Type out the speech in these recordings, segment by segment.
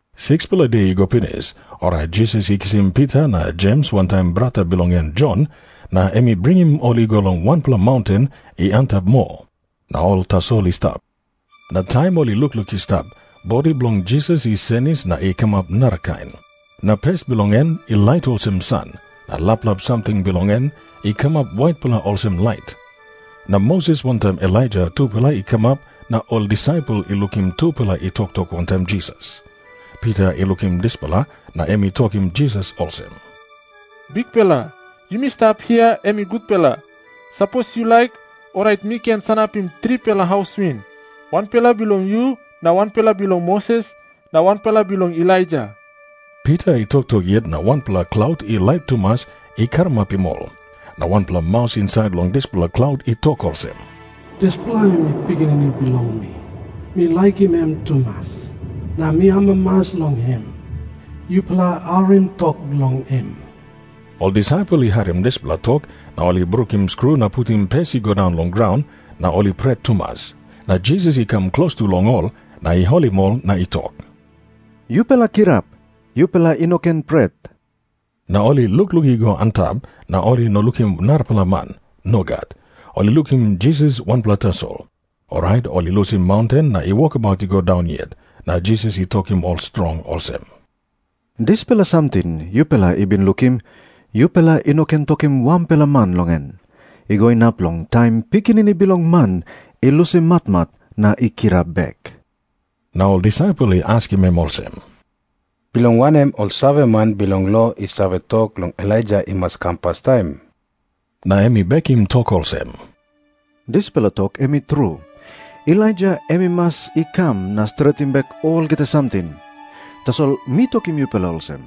16-pela de i go pinis, orait Jisas i kisim Pita na Jems wantaim brata bilong en Jon, na em i bringim ol i go long wanpela maunten i antap moa. Na ol tasol i stap. Na taim ol i lukluk i stap, bodi bilong Jisas i senis na i kamap narakain. Na pes bilong en i lait olsem san, na laplap samting bilong en i kamap waitpela olsem lait. Na Moses wantaim Elaija tupela i kamap na ol disaipel i lukim tupela i toktok wantaim Jisas. Pita i lukim dispela na em i tokim Jisas olsem, “Bikpela, yumi stap hia, em i gutpela. Sapos yu laik, orait mi ken sanapim tripela haus win, wanpela bilong yu na wanpela bilong Moses na wanpela bilong Elaija.” Pita i toktok yet na wanpela klaut i lait tumas i karamapim ol. Na wanpela maus insait long dispela klaut i tok olsem, “Dispela em i Pikinini bilong mi, mi laikim em tumas, na mi amamas long em. Yupela harim tok bilong em.” Ol disaipel i harim dispela tok, na ol i brukim skru na putim pes i go daun long graun, na ol i pret tumas. Na Jisas i kam klostu long ol na i holim ol, na i tok, “Yupela kirap. Yupela i no ken pret.” Na ol i lukluk i go antap, na ol i no lukim narapela man. Nogat. Ol i lukim Jisas wanpela tasol. Orait ol i lusim maunten na i wokabaut i go daun yet, na Jisas i tokim ol strong olsem, “Dispela samting yupela i bin lukim, yupela i no ken tokim wanpela man long en, i go inap long taim Pikinini Bilong Man i lusim matmat na i kirap bek.” Na ol disaipel i askim em olsem, “Bilong wanem ol saveman bilong lo i save tok long Elaija i mas i kam pastaim?” Na em i bekim tok olsem, “Dispela tok em i tru. Elaija em i mas i kam na stretim bek olgeta samting. Tasol mi tokim yupela olsem,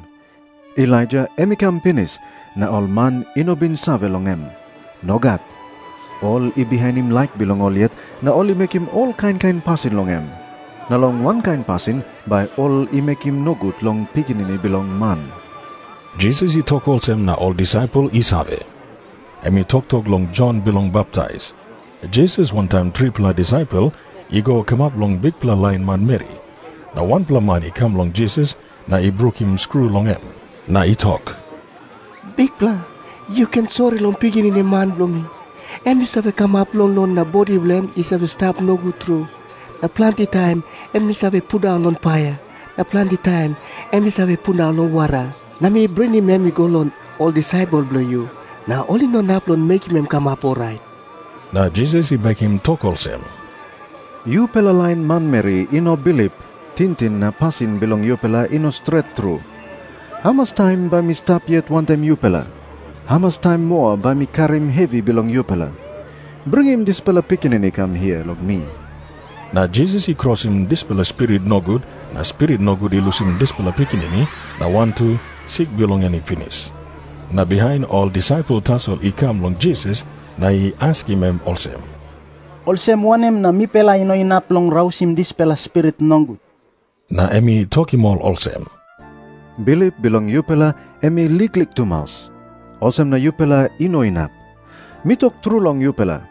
Elaija em i kam pinis, na ol man i no bin save long em. Nogat. Ol i bihainim laik bilong ol yet na ol i mekim ol kain kain pasin long em. Na long wankain pasin bai ol i mekim nogut long Pikinini Bilong Man.” Jisas i tok olsem, na ol disaipel i save, em i toktok long Jon Bilong Baptais. Jisas wantaim tripela disaipel i go kamap long bikpela lain manmeri, na wanpela man i kam long Jisas na i brukim skru long em na i tok, “Bikpela, yu ken sori long pikinini man bilong mi. Em i save kamap longlong na bodi bilong en i stap nogut tru. Na planti taim em i save pundaun long paia, na planti taim em i save pundaun long wara. Na mi bringim em i go long ol disaipel bilong yu, na ol i no inap mekim em i kamap orait.” Na Jisas i bekim tok olsem, “Yupela lain manmeri i no bilip, tingting na pasin bilong yupela i no stret tru. Hamas taim bai mi stap yet wantaim yupela? Hamas taim moa bai mi karim hevi bilong yupela? Bringim dispela pikinini i kam hia long mi.” Na Jisas i krosim dispela spirit nogut, na spirit nogut i lusim dispela pikinini na wantu sik bilong en i pinis. Na bihain ol disaipel tasol i kam long Jisas na i askim em olsem, “Olsem wanem na mipela i no inap long rausim dispela spirit nogut?” Na em i tokim ol olsem, “Bilip bilong yupela em i liklik tumas, olsem na yupela i no inap. Mi tok tru long yupela,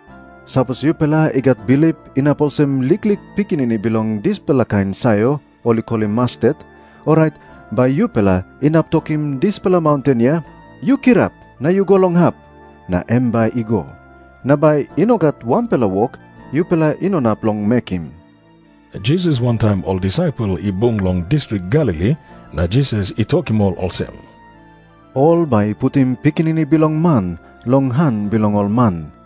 sapos yupela i gat bilip inap olsem liklik pikinini bilong dispela kain sayor ol i kolim mastet, orait bai yupela inap tokim dispela maunten hia, ‘Yu kirap na yu go long hap,’ na em bai i go. Na bai i no gat wanpela wok yupela i no inap long mekim.” Jisas wantaim ol disaipel i bung long distrik Galili, na Jisas i tokim ol olsem, “Ol bai i putim Pikinini Bilong Man long han bilong ol man,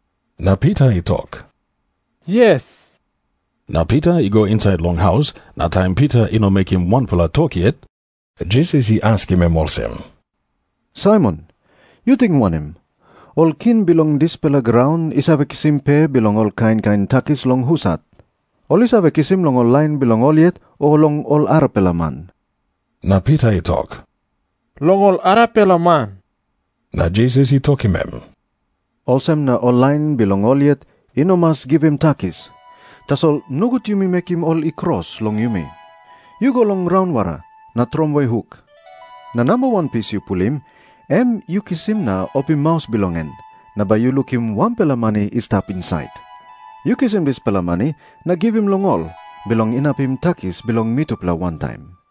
Na Pita i tok, “Yes.” Na Pita i go insait long haus, na taim Pita i no mekim wanpela tok yet, Jisas i askim em olsem, “Saimon, yu ting wanem? Ol king bilong dispela graun i save kisim pe bilong ol kain kain takis long husat? Ol i save kisim long ol lain bilong ol yet, o long ol arapela man?” Na Pita i tok, “Long ol arapela man.” Na Jisas i tokim em, “Olsem na ol lain bilong ol yet i no mas givim takis. Tasol nogut yumi mekim ol i kros long yumi. Yu go long raunwara na tromoi huk. Na namba wan pis yu pulim, em yu kisim na opim maus bilong en, na bai yu lukim wanpela mani i stap insait. Yu kisim dispela mani na givim long ol, bilong inapim takis bilong mitupela wantaim.”